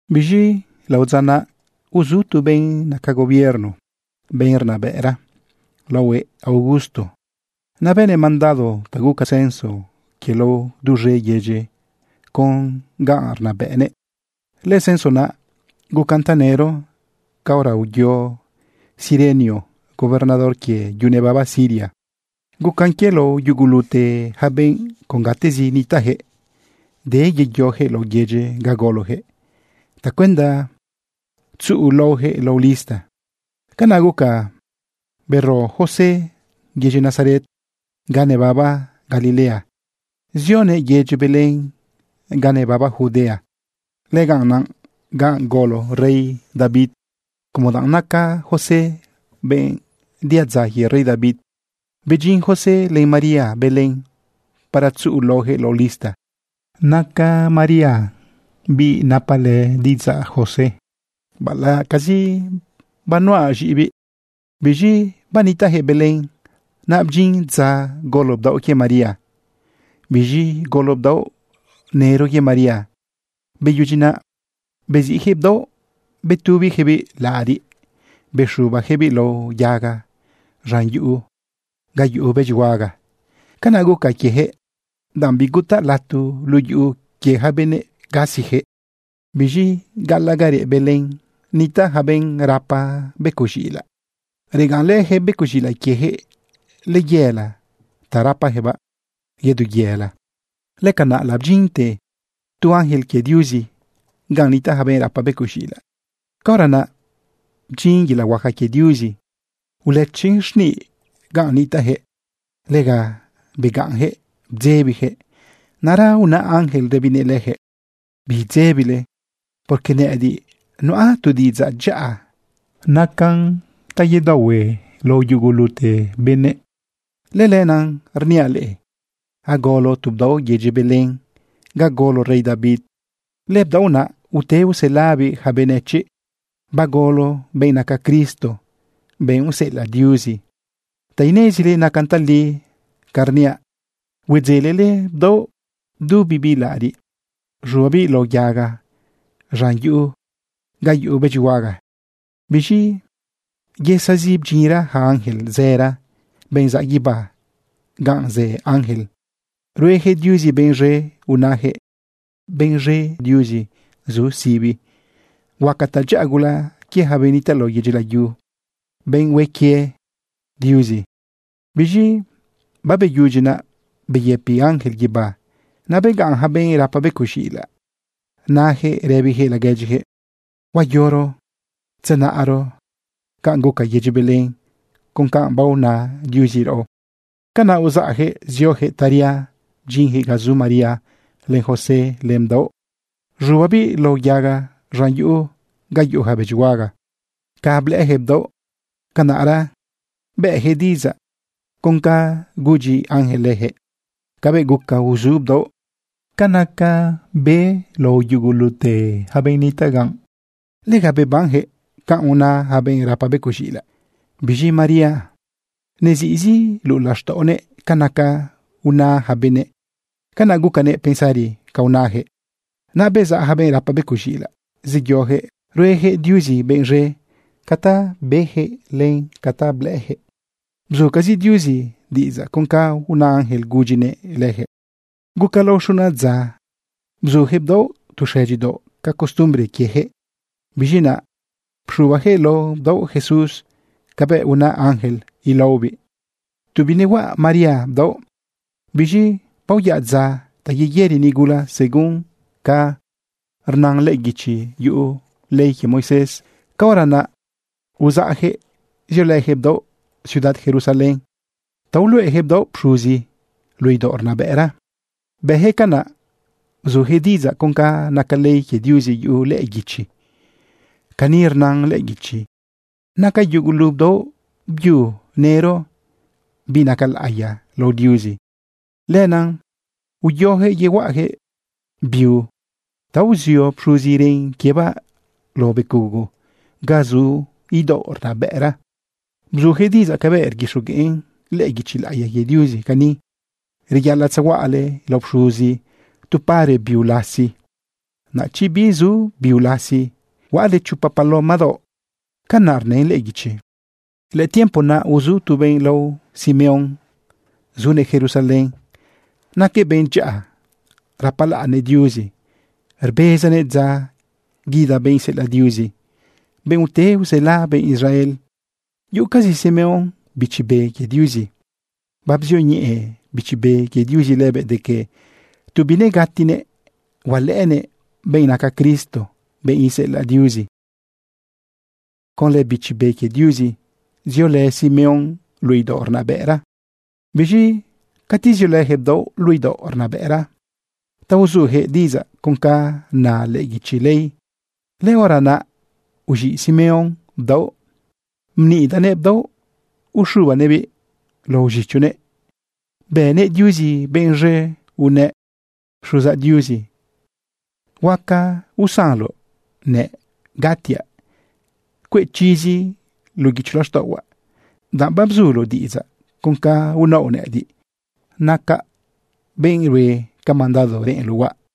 Biz̃i lao dza naꞌ, uzu tu benꞌ naca gobierno, benꞌ rnabëꞌra laohuëꞌ Augusto. Naꞌ bënëꞌ mandado ta guca censo quie lao duz̃e yedyi con ga rnabëꞌnëꞌ. Lëcenso naꞌ gucan tanëro caora uyo Cirenio gobernador quie yu nebaba Siria. Gucan quie lao yugulute yaca benꞌ con gatezi nitaꞌyaquëꞌ de yeyoyaquëꞌ lao yedyi ga goloyaquëꞌ tacuenda tzuꞌu laoyaquëꞌ lao lista. Canaꞌ guca bero José yedyi Nazaret ga nebaba Galilea zioguëꞌ yedyi Belén ga nebaba Judea. Lëganꞌ naꞌ ga golo rey David como danꞌ naca José benꞌ diadza quie rey David. Bedyin José len María Belén para tzuꞌu laoyaquëꞌ lao lista. Naca María biꞌ banapalë diꞌidzaꞌ José baꞌalaꞌcazi banuꞌa z̃iꞌibiꞌ. Biz̃i banitaꞌyaquëꞌ Belén naꞌ, bdyin dza golo bdaoꞌ quie María. Biz̃i golo bdaoꞌ nëro quie María. Beyudyi naꞌ beziꞌyaquëꞌ bdaoꞌ betubiyaquëꞌbiꞌ laꞌariꞌ bexubayaquëꞌbiꞌ lao yaga z̃an yuꞌu ga yuꞌu bëdyihuaga. Canaꞌ guca quieyaquëꞌ, danꞌ bigutaꞌ lato luꞌu yuꞌu quie yaca benëꞌ gasiyaquëꞌ. Biz̃i gaꞌalaꞌ ga reꞌ Belén nitaꞌ yaca benꞌ rapa becoꞌ z̃iꞌilaꞌ. Regaꞌnlëyaquëꞌ becoꞌ z̃iꞌilaꞌ quieyaquëꞌ layela ta rapayaquëꞌbaꞌ yedu yela. Lëcanaꞌ labdyinte tu ángel quie Diuzi ganꞌ nitaꞌ yaca benꞌ rapa becoꞌ z̃iꞌilaꞌ. Caora naꞌ bdyin yelaꞌ huaca quie Diuzi ulëchin xniꞌ ganꞌ nitaꞌyaquëꞌ. Lega begaꞌnyaquëꞌ bdzebiyaquëꞌ. Naꞌra una ángel rëbinëꞌ leyaquëꞌ: ―Bidzebile, porque nëꞌëdiꞌ nuꞌa tu diꞌidzaꞌ dyaꞌa nacan ta yedaohue lao yugulute benëꞌ. Lëlenaꞌ rniaꞌ leꞌe agolo tu bdaoꞌ yedyi Belén ga golo rey David. Lëbdaoꞌ naꞌ ute uselabiꞌ yaca benëchiꞌ. Bagolo benꞌ naca Cristo, benꞌ useꞌelaꞌ Diuzi. Ta inezile nacan tali ca rniaꞌ, huedzelele bdaoꞌ bdubibiꞌ laꞌariꞌ z̃ubabiꞌ lao yaga z̃an yuꞌu ga yuꞌu bëdyihuaga. Biz̃i yesazi bdyinra yaca ángel zëra, benꞌ zaꞌ guibá ganꞌ zë ángel, ruejëꞌ Diuzi benꞌ z̃e unayaquëꞌ: ¡Benꞌ z̃e Diuzi zu sibi! ¡Huaca tadyaꞌa gula quie yaca benꞌ nitaꞌ lao yedyi layu, benꞌ hue quie Diuzi! Biz̃i babeyudyi naꞌ, beyëpi yaca ángel guibá. Naꞌ begaꞌn yaca benꞌ rapa becoꞌ z̃iꞌilaꞌ nayaquëꞌ rëbiyaquëꞌ laguedyiyaquëꞌ: ―Huayoro tzenaꞌro canꞌ guca yedyi Belén con ca baona Diuzi raꞌo. Canaꞌ uzaꞌyaquëꞌ zioyaquëꞌ taria bdyinyaquëꞌ ga zu María len José len bdaoꞌ z̃ubabiꞌ lao yaga z̃an yuꞌu ga yuꞌu yaca bëdyihuaga. Ca blëꞌëyaquëꞌ bdaoꞌ, canaꞌra bëꞌyaquëꞌ diꞌidzaꞌ con canꞌ gudyi ángel leyaquëꞌ cabëꞌ guca uzu bdaoꞌ. Ca naca be lao yugulute yaca benꞌ nitaꞌ ganꞌ, lega bebanyaquëꞌ canꞌ una yaca benꞌ rapa becoꞌ z̃iꞌilaꞌ. Biz̃i María nezizi luꞌu laxtaꞌonëꞌ ca naca una yaca benëꞌ. Canaꞌ gucanëꞌ pensari ca unajëꞌ. Naꞌ bezaꞌ yaca benꞌ rapa becoꞌ z̃iꞌilaꞌ zeyoyaquëꞌ rueyaquëꞌ Diuzi benꞌ z̃e ca ta beyaquëꞌ len ca ta blëꞌëyaquëꞌ. Bzucazi Diuzi diꞌidzaꞌ con ca una ángel gudyinëꞌ leyaquëꞌ. Guca lao xuna dza bzuyaquëꞌ bdaoꞌ tu xëdyidaoꞌ ca costumbre quieyaquëꞌ. Biz̃i naꞌ pxubayaquëꞌ lao bdaoꞌ JESUS cabëꞌ una ángel ilaobiꞌ tu binehuaꞌa María bdaoꞌ. Biz̃i baoyaꞌ dza ta yeyëri nigula según ca rna lëꞌë guichi yuꞌu ley quie Moisés. Caora naꞌ uzaꞌyaquëꞌ ziolëyaquëꞌ bdaoꞌ ciudad Jerusalén ta uluꞌeyaquëꞌ bdaoꞌ pxuzi luꞌu idaoꞌ rnabëꞌra. Bëyaquëꞌ canaꞌ bzuyaquëꞌ diꞌidzaꞌ con ca naca ley quie Diuzi yuꞌu lëꞌë guichi. Cani rnan lëꞌë guichi: “Naca yugulu bdaoꞌ byu nëro biꞌ naca laꞌiya lao Diuzi.” Lenaꞌ uyoyaquëꞌ yehuaꞌayaquëꞌ biu ta uzio pxuzi ren quiebaꞌ lao becugo ga zu idaoꞌ rnabëꞌra. Bzuyaquëꞌ diꞌidzaꞌ cabëꞌ rguixogueꞌn lëꞌë guichi laꞌiya quie Diuzi cani: “Reyaꞌalaꞌ tzehuaꞌale lao pxuzi tu pare biu lasi, naꞌ chi bizu biu lasi, huaꞌale chopa paloma daoꞌ.” Canaꞌ rnën lëꞌë guichi. Lëtiempo naꞌ uzu tu benꞌ lao Simeón zunëꞌ Jerusalén. Naquëꞌ benꞌ dyaꞌa, rapalaꞌnnëꞌ Diuzi, rbezanëꞌ dza guida benꞌ iseꞌelaꞌ Diuzi, benꞌ ute usela benꞌ Israel. Yuꞌucazi Simeón Bichi Be quie Diuzi. Babzioñeꞌe Bichi Be quie Diuzi lëbëꞌ de que tu binegatinëꞌ hualëꞌënëꞌ benꞌ naca Cristo, benꞌ iseꞌelaꞌ Diuzi. Conlë Bichi Be quie Diuzi ziolë Simeón luꞌu idaoꞌ rnabëꞌra. Biz̃i cati ziolëyaquëꞌ bdaoꞌ luꞌu idaoꞌ rnabëꞌra ta uzuyaquëꞌ diꞌidzaꞌ con ca na lëꞌë guichi ley, lëhora naꞌ uz̃iꞌ Simeón bdaoꞌ bnidaguëꞌ bdaoꞌ uxubanëꞌbiꞌ lao z̃ichonëꞌ bëguëꞌ Diuzi benꞌ z̃e unëꞌ: Xuzaꞌ Diuzi, huaca usanloꞌnëꞌ gatiaꞌ cueꞌ chizi luꞌu guicho laxtaꞌohuaꞌ, danꞌ babzuloꞌ diꞌidzaꞌ con ca unaoꞌ nëꞌëdiꞌ, nacaꞌ benꞌ rue ca mandado reꞌenloꞌ huaꞌ.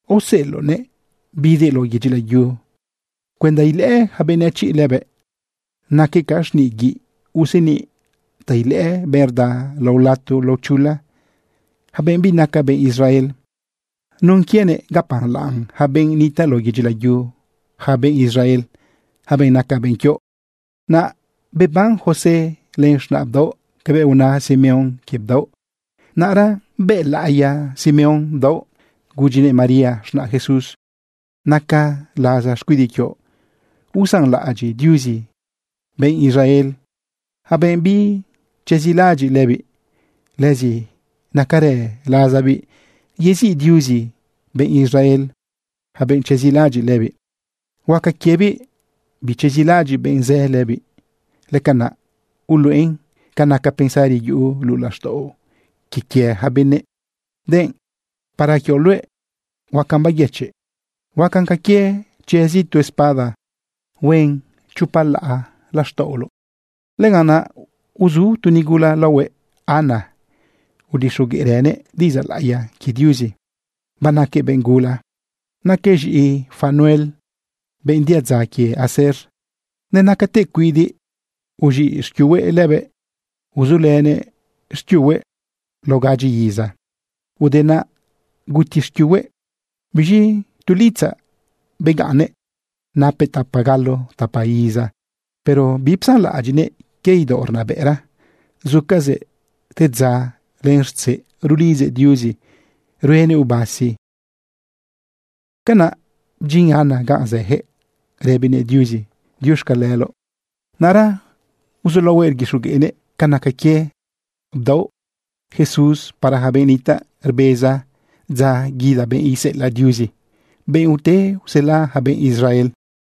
Aoseꞌeloꞌnëꞌ bidëꞌ lao yedyi layu cuenda ilëꞌë yaca benëchiꞌ lëbëꞌ. Naquëꞌ ca xniꞌ guiꞌ useniꞌ ta ilëꞌë benꞌ rda lao lato lao chula, yaca benꞌ binaca benꞌ Israel. Nun quienëꞌ gapalaꞌn yaca benꞌ nitaꞌ lao yedyi layu yaca benꞌ Israel, yaca benꞌ naca benꞌ quioꞌ. Naꞌ beban José len z̃naꞌ bdaoꞌ cabëꞌ una Simeón quie bdaoꞌ. Naꞌra bëlaꞌiya Simeón bdaoꞌ gudyinëꞌ María z̃naꞌ Jesús: ―Naca laza xcuidiꞌ quioꞌ usanlaꞌadyiꞌ Diuzi benꞌ Israel, yaca benꞌ bichezilaꞌadyiꞌ lëbiꞌ. Lëzi nacarë lazabiꞌ yeziꞌ Diuzi benꞌ Israel, yaca benꞌ chezilaꞌadyiꞌ lëbiꞌ. Huaca quiebiꞌ bichezilaꞌadyiꞌ benꞌ zë lëbiꞌ. Lëcanaꞌ uluꞌen ca naca pensari yuꞌu luꞌu laxtaꞌo quie quie yaca benëꞌ. Denꞌ para quioꞌ luëꞌ, huacan bayëchiꞌ. Huacan ca quie chezi tu espada huen chopa laꞌa laxtaꞌoloꞌ. Lëganꞌ naꞌ uzu tu nigula laohuëꞌ Ana. Udixogueꞌrënëꞌ diꞌidzaꞌ laꞌiya quie Diuzi. Banaquëꞌ benꞌ gula, naquëꞌ z̃iꞌi Fanuel, benꞌ diadza quie Aser. Nenacatëꞌ cuidiꞌ uz̃iꞌ xquiuhuëꞌ lëbëꞌ. Uzulënëꞌ xquiuhuëꞌ lao gadyi iza, ude naꞌ guti xquiuhuëꞌ. Biz̃i tu litzaꞌ begaꞌnnëꞌ napëꞌ tapa galo tapa iza. Pero bipsanlaꞌadyiꞌnëꞌ quie idaoꞌ rnabëꞌra. Zucazëꞌ te dza len rtzeꞌ rulidzëꞌ Diuzi ruenëꞌ ubasi. Canaꞌ bdyin Ana ganꞌ zëyaquëꞌ rëbinëꞌ Diuzi diuxcaleloꞌ. Naꞌra uzulaohuëꞌ rguixogueꞌnëꞌ ca naca quie bdaoꞌ Jesús para yaca benꞌ nitaꞌ rbeza dza guida benꞌ iseꞌelaꞌ Diuzi, benꞌ ute usela yaca benꞌ Israel.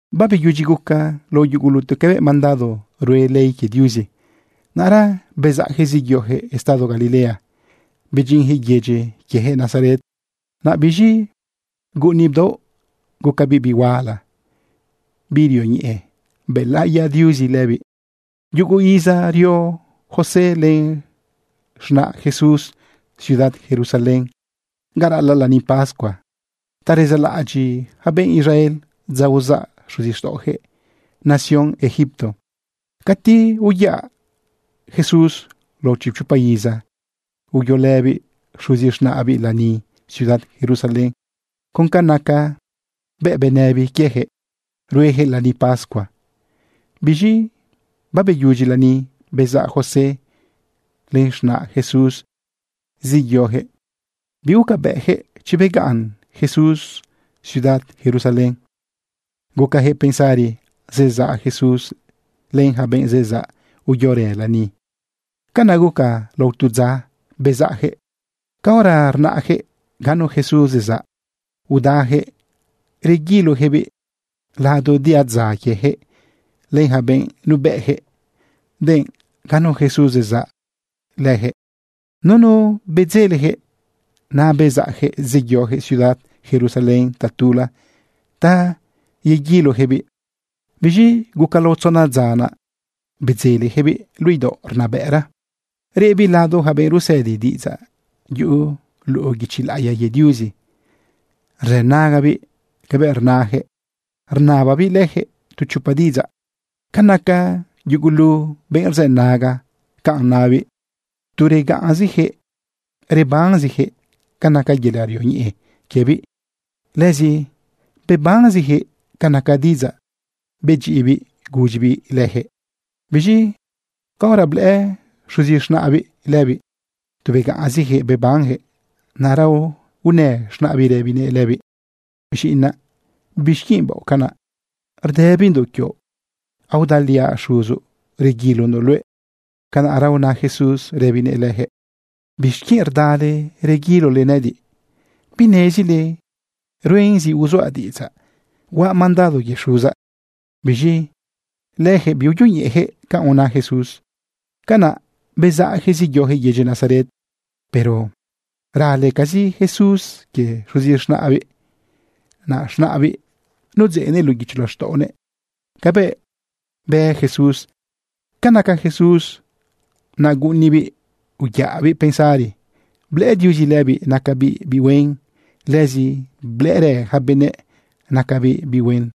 Babeyudyi guca lao yugulute cabëꞌ mandado rue ley quie Diuzi, naꞌra bezaꞌyaquëꞌ zeyoyaquëꞌ estado Galilea bedyinyaquëꞌ yedyi quieyaquëꞌ Nazaret. Naꞌ biz̃i guꞌuni bdaoꞌ, gucabiꞌ biꞌ huala, biꞌ rioñeꞌe. Bëlaꞌiya Diuzi lëbiꞌ. Yugu iza rio José len z̃naꞌ Jesús ciudad Jerusalén ga raꞌalaꞌ lani pascua ta rezalaꞌadyiꞌ yaca benꞌ Israel dza uzaꞌ xuzixtaꞌoyaquëꞌ nación Egipto. Cati uyaꞌ Jesús lao chipchopa iza, uyolëbiꞌ xuzi z̃naꞌbiꞌ lani ciudad Jerusalén con ca naca biuꞌ benëbiꞌ quieyaquëꞌ rueyaquëꞌ lani pascua. Biz̃i babeyudyi lani, bezaꞌ José len z̃naꞌ Jesús zeyoyaquëꞌ bigucabëꞌyaquëꞌ chi begaꞌn Jesús ciudad Jerusalén. Gucayaquëꞌ pensari zezaꞌ Jesús len yaca benꞌ zezaꞌ uyorë lani. Canaꞌ guca lao tu dza bezaꞌyaquëꞌ. Caora rnaꞌyaquëꞌ ganu Jesús zezaꞌ, udayaquëꞌ rguiloyaquëꞌbiꞌ lado diadza quieyaquëꞌ, len yaca benꞌ nubëꞌyaquëꞌ, denꞌ ganu Jesús zezaꞌ leyaquëꞌ. Nunu bedzeleyaquëꞌ. Naꞌ bezaꞌyaquëꞌ zeyoyaquëꞌ ciudad Jerusalén tatula ta yeguiloyaquëꞌbiꞌ. Biz̃i guca lao tzona dza naꞌ, bedzeleyaquëꞌbiꞌ luꞌu idaoꞌ rnabëꞌra. Reꞌbiꞌ lado yaca benꞌ rusëdi diꞌidzaꞌ yuꞌu luꞌu guichi laꞌiya quie Diuzi. Rzënagabiꞌ ca rnayaquëꞌ rnababiꞌ leyaquëꞌ tu chopa diꞌidzaꞌ. Ca naca yugulu benꞌ rzënaga canꞌ nabiꞌ, tu begaꞌnziyaquëꞌ bebanziyaquëꞌ ca naca yelaꞌ rioñeꞌe quiebiꞌ, lëzi bebanziyaquëꞌ ca naca diꞌidzaꞌ bedyiꞌibiꞌ gudyibiꞌ leyaquëꞌ. Biz̃i caora blëꞌë xuzi z̃naꞌbiꞌ lëbiꞌ, tu begaꞌnziyaquëꞌ bebanyaquëꞌ. Naꞌra unë z̃naꞌbiꞌ rëbinëꞌ lëbiꞌ: ―Ziꞌinaꞌ, ¿bixquienꞌ baoꞌ canaꞌ? Rdëbindoꞌ quioꞌ. Aodaliaꞌ xuzoꞌ reguilondoꞌ luëꞌ. Canaꞌra una Jesús rëbinëꞌ leyaquëꞌ: ―¿Bixquienꞌ rdale reguilole nëꞌëdiꞌ? ¿Binezile ruen zi uzuaꞌ diꞌidzaꞌ huaꞌ mandado quie Xuzaꞌ? Biz̃i leyaquëꞌ biuyoñeꞌeyaquëꞌ canꞌ una Jesús. Canaꞌ bezaꞌyaquëꞌ zeyoyaquëꞌ yedyi Nazaret, pero ralecazi Jesús quie xuzi z̃naꞌbiꞌ. Naꞌ z̃naꞌbiꞌ nudzeꞌnëꞌ luꞌu guicho laxtaꞌonëꞌ cabëꞌ bë Jesús. Ca naca Jesús naꞌ guꞌunibiꞌ uyaꞌabiꞌ pensari. Blëꞌë Diuzi lëbiꞌ nacabiꞌ biꞌ huen. Lëzi blëꞌërë yaca benëꞌ nacabiꞌ biꞌ huen.